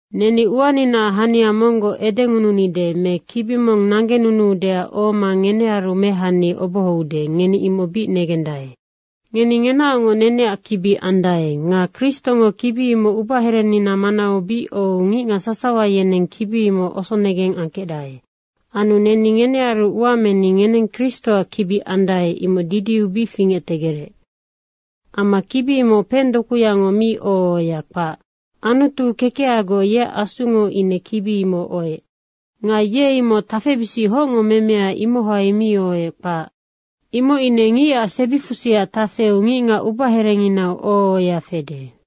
Neni uaninaac hania monggoc edengununide me kibi mong nanggenunuudeac ohoma ngenearu mehani obohoude, ngeni imoc bic negendae. Ngeni ngenaocngoc neneac kibi andae. Nga Kristongo kibi imoc ubaherenina manau bic ohou ngicngac sasawa yeneng kibi imoc osonegeng angkecdae. Anu neni ngenearu ua meni ngeneng Kristoac kibi andae, imoc didiu bic fingectegerec. Amma kibi imoc pengdokuyango mi oho ohoya, kpac. Anutu kekehagoc yeac Asungo ine kibi imoc ohoec. Nga ye imoc tafebisic hocngo memea, imohai mi ohoec, kpac. Imoc ine ngicac sebifusiac tafeu ngicngac ubaherenginau oho ohoya fede.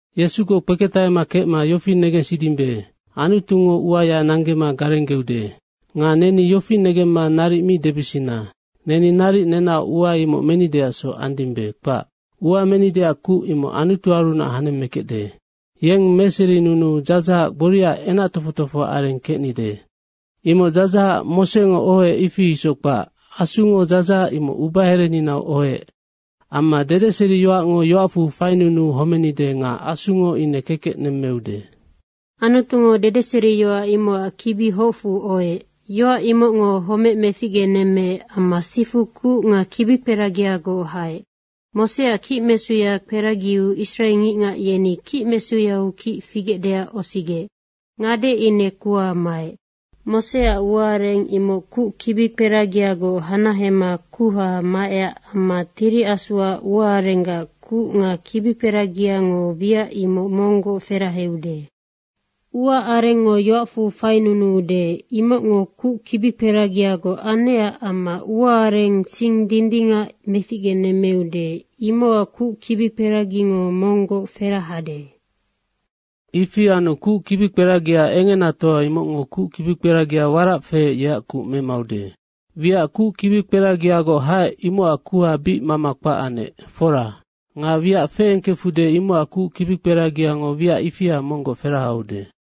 Yesugoc kpeketahema kecma yofi negensidimbe, Anutungo uaya nanggema garenggeude. Nga neni yofi negemma naric mi debisina, “Neni naric nenaoc ua imoc menideacsoc andimbe.” kpac. Ua menideac kuc, imoc Anutuarunac hanemmekecde. Yeng meserinunuu dzadzahac gboriaac kingangkpekpe kecnideac. Imoc dzadzahac Mosengo ohoec, ifi isoc kpac. Asungo dzadzahac imoc ubahereninau ohoec. Amma dedeseriyoacngo yoacfu fainunuu homenide nga Asungo ine kekec nemmeude. Anutungo dedeseriyoac imocac kibi hocfu ohoec. Yoac imocngo homec meficgenemmeec amma sifu kuc nga kibikperagiagoc haec. Moseac kicmesuya kperagiu Israe ngicngac yeni kicmesuyau kic figecdeac osigec. Ngade ine kuha maec. Moseac ua areng imoc kuc kibikperagigoc hanahema kuha maecac amma Tiri Asuac ua arenggac kuc nga kibikperagiango wiac imoc monggoc feraheude. Ua arengngo yoacfu fainunuande, imocngo kuc kibikperagiagoc anecac amma ua areng sing dindingac meficgenemmeude, imocac kuc kibikperagiango monggoc ferahade. Ifi anu kuc kibikperagia engenatoa imocngo kuc kibikperagia warac feec yeac kuc memaude. Wiac kuc kibikperagiagoc haec, imocac kuha bic mama kpac anec, fora. Nga wiac feengkefude, imocac kuc kperagiango wiac ifia monggoc ferahaude.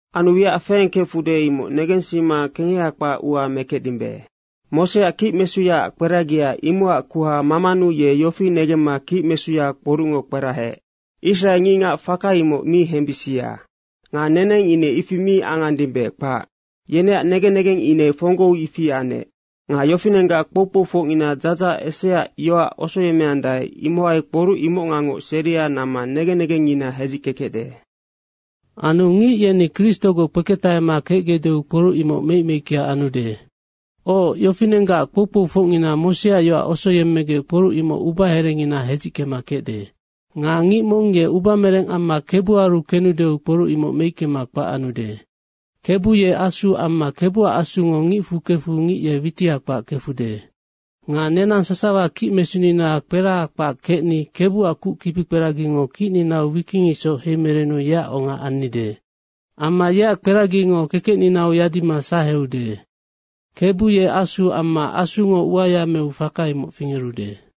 Anu wiac feengkefude, imoc negensima kengeha kpac ua mekecdimbe. Moseac kicmesuyaac kperagia, imocac kuha mamanu ye yofi negemma kicmesuya kporucngo kperahaec, “Israe ngicngac faka imoc mi hembisia.” Nga neneng ine ifi mi angandimbe, kpac. Yeneac negen negeng ine fonggou ifi anec. Nga yofinenggac kpou kpoufocngina dzadzahac eseaac yoac osoyemmeandae, imohai kporuc imocngangoc seria namma negen negengngina hedzickekecde. Anu ngic yeni Kristogoc kpeketahegecdeu kporuc imoc meicmeickea anude. Oc, yofinenggac kpou kpoufocngina Moseac yoac osoyemmegec kporuc imoc ubaherengina hedzickekecde. Nga ngic mong ye ubamereng amma Kebuaru kenudeu kporuc imoc meickema kpac anude. Kebu ye Asu amma Kebuac Asungo ngicfu kefu ngic ye witiha kpac kefude. Nga nenang sasawa kicmesunina kperaha kpac kecni Kebuac kuc kibikperagingo kicninau wiking isoc heimerenu yeac onga annide. Amma yeac kperagingo kekecninau yadima saheude. Kebu ye Asu amma Asungo uaya meu faka imoc fingerude.